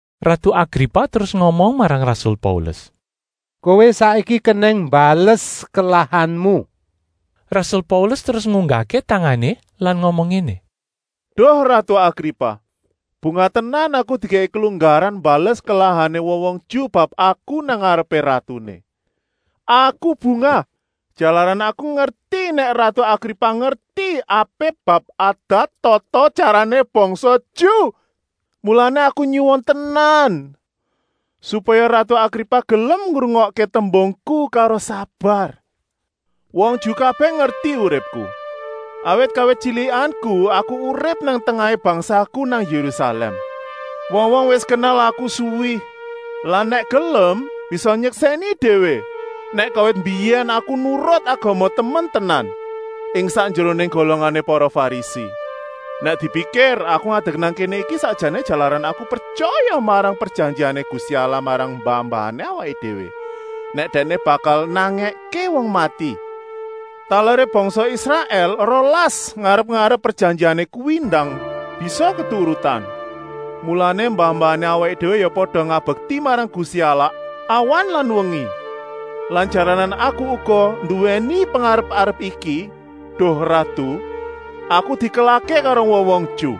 Ratu Agripa terus ngomong marang rasul Paulus: “Kowé saiki kenèng mbales kelahanmu!” Rasul Paulus terus ngunggahké tangané lan ngomong ngéné: “Duh ratu Agripa, bungah tenan aku dikèki kelunggaran mbales kelahané wong-wong Ju bab aku nang ngarepé ratuné. Aku bungah, jalaran aku ngerti nèk ratu Agripa ngerti apik bab adat-tata-tyarané bangsa Ju. Mulané aku nyuwun tenan, supaya ratu Agripa gelem ngrungokké tembungku karo sabar. “Wong Ju kabèh ngerti uripku, awit kawit tyilikanku aku urip nang tengahé bangsaku nang Yérusalèm. Wong-wong wis kenal aku suwi lan nèk gelem bisa nyeksèni déwé nèk kawit mbiyèn aku nurut agama temen tenan, ing sakjeroné golongané para Farisi. Nèk dipikir aku ngadek nang kéné iki sakjané jalaran aku pretyaya marang prejanjiané Gusti Allah marang mbah-mbahané awaké déwé, nèk Dèkné bakal nangèké wong mati. Taleré bangsa Israèl rolas ngarep-arep prejanjian kuwi ndang bisa keturutan, mulané mbah-mbahané awaké déwé ya pada ngabekti marang Gusti Allah awan lan wengi. Lan jalaran aku uga nduwèni pengarep-arep iki, duh ratu, aku dikelahké karo wong-wong Ju.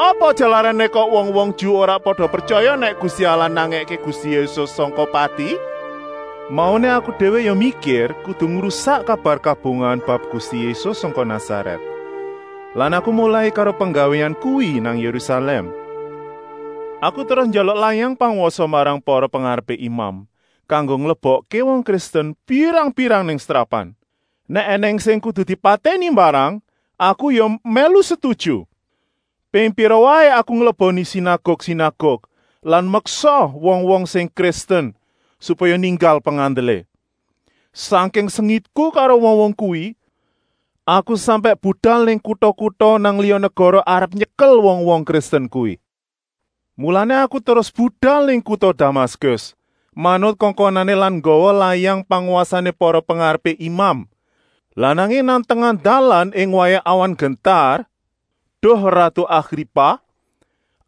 Apa jalarané kok wong-wong Ju ora pada pretyaya nèk Gusti Allah nangèké Gusti Yésus sangka pati? “Mauné aku déwé ya mikir kudu ngrusak kabar kabungahan bab Gusti Yésus sangka Nasarèt. Lan aku molai karo penggawéan kuwi nang Yérusalèm. Aku terus njaluk layang pangwasa marang para pengarepé imam, kanggo nglebokké wong Kristen pirang-pirang nang setrapan. Nèk ènèng sing kudu dipatèni mbarang aku ya mèlu setuju. Ping pira waé aku ngleboni sinaguk-sinaguk lan meksa wong-wong sing Kristen supaya ninggal pengandelé. Sangking sengitku karo wong-wong kuwi, aku sampèk budal nang kuta-kuta nang liya negara arep nyekel wong-wong Kristen kuwi. “Mulané aku terus budal nang kuta Damaskus, manut kongkonané lan nggawa layang pangwasané para pengarepé imam. Lah nanging nang tengah dalan ing wayah awan nggentar, duh ratu Agripa,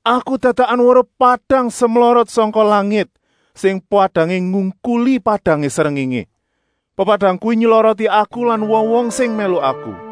aku dadakan weruh padang semlorot sangka langit, sing padangé ngungkuli padangé srengéngé. Pepadang kuwi nyloroti aku lan wong-wong sing mèlu aku.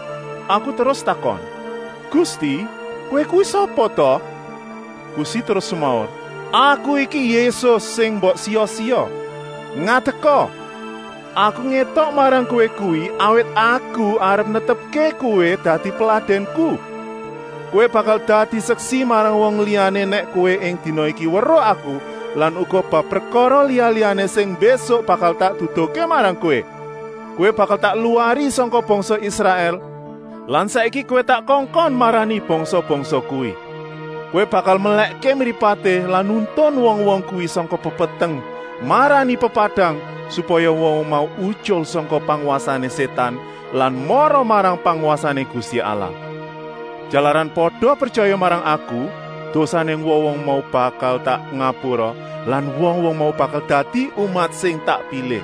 Aku terus takon: ‘Gusti, kowé kuwi sapa ta?’ Gusti terus semaur: ‘Aku iki Yésus, sing mbok siya-siya. Ngadeka. Aku ngétok marang kowé kuwi awit Aku arep netepké kowé dadi peladènku. Kowé bakal dadi seksi marang wong liyané nèk kowé ing dina iki weruh Aku lan uga bab prekara liya-liyané sing mbésuk bakal tak duduhké marang kowé. Kowé bakal tak luwari sangka bangsa Israèl lan bangsa liya-liyané lan saiki kowé tak kongkon marani bangsa-bangsa kuwi. Kowé bakal melèkké mripaté lan nuntun wong-wong kuwi sangka pepeteng marani pepadang, supaya wong-wong mau utyul sangka pangwasané Sétan lan mara marang pangwasané Gusti Allah. Jalaran pada pretyaya marang Aku, dosané wong-wong mau bakal tak ngapura lan wong-wong mau bakal dadi umat sing tak pilih.’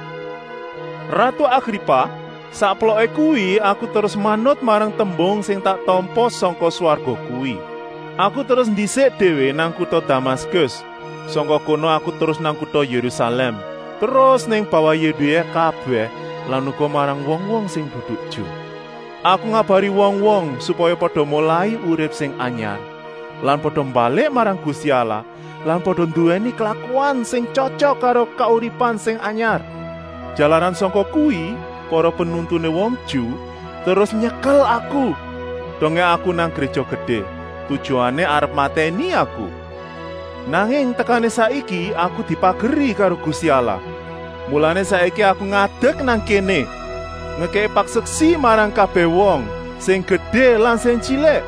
“Ratu Agripa, sakploké kuwi aku terus manut marang tembung sing tak tampa sangka swarga kuwi. Aku terus ndisik déwé nang kuta Damaskus, sangka kono aku terus nang kuta Yérusalèm, terus nang bawah Yudéa kabèh lan uga marang wong-wong sing dudu Ju. Aku ngabari wong-wong, supaya pada molai urip sing anyar lan pada mbalik marang Gusti Allah lan pada nduwèni klakuan sing tyotyok karo kauripan sing anyar. Jalaran sangka kuwi para penuntuné wong Ju terus nyekel aku, dongé aku nang Gréja Gedé, tujuané arep matèni aku. Nanging tekané saiki aku dipageri karo Gusti Allah, mulané saiki aku ngadek nang kéné, ngekèki paseksi marang kabèh wong, sing gedé lan sing tyilik.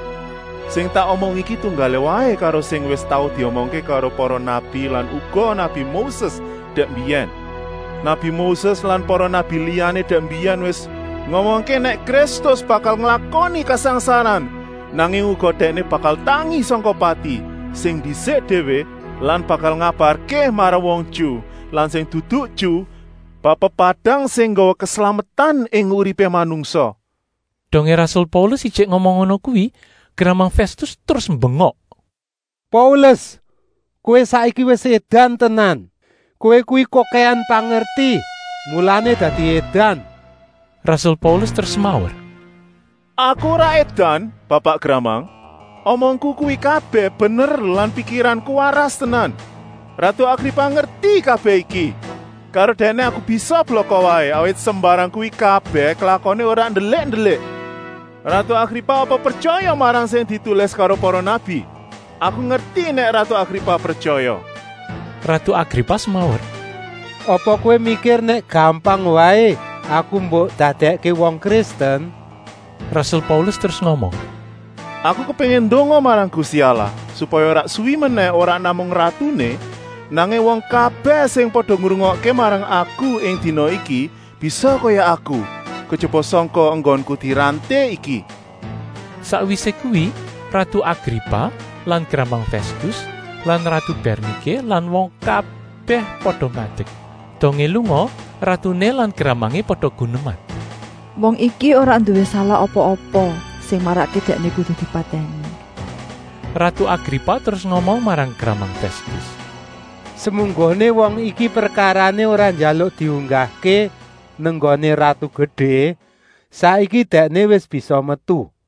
Sing tak omong iki tunggalé waé karo sing wis tau diomongké karo para nabi lan uga nabi Moses dèk mbiyèn. Nabi Moses lan para nabi liyané dèk mbiyèn wis ngomongké nèk Kristus bakal nglakoni kasangsaran, nanging uga Dèkné bakal tangi sangka pati sing ndisik déwé lan bakal ngabarké marang wong Ju lan sing dudu Ju bab pepadang sing nggawa keslametan ing uripé manungsa.” Dongé rasul Paulus ijik ngomong ngono kuwi, gramang Fèstus terus mbengok: “Paulus, kowé saiki wis édan tenan! Kowé kuwi kokèhan pangerti, mulané dadi édan.” Rasul Paulus terus semaur: “Aku ora édan, bapak gramang. Omongku kuwi kabèh bener lan pikiranku waras tenan. Ratu Agripa ngerti kabèh iki. Karo dèkné aku bisa blaka waé, awit sembarang kuwi kabèh klakoné ora ndelik-ndelik! Ratu Agripa apa pretyaya marang sing ditulis karo para nabi? Aku ngerti nèk ratu Agripa pretyaya.” Ratu Agripa semaur: “Apa kowé mikir nèk gampang waé aku mbok dadèkké wong Kristen?” Rasul Paulus terus ngomong: “Aku kepéngin ndonga marang Gusti Allah, supaya ora suwi menèh ora namung ratuné, nanging wong kabèh sing pada ngrungokké marang aku ing dina iki bisa kaya aku, kejaba sangka enggonku diranté iki.” Sakwisé kuwi ratu Agripa lan gramang Fèstus lan ratu Bèrniké lan wong kabèh pada ngadek. Dongé lunga, ratuné lan gramangé pada guneman: “Wong iki ora nduwé salah apa-apa sing marakké dèkné kudu dipatèni.” Ratu Agripa terus ngomong marang gramang Fèstus: “Semunggoné wong iki prekarané ora njaluk diunggahké nang nggoné ratu gedé, saiki dèkné wis bisa metu.”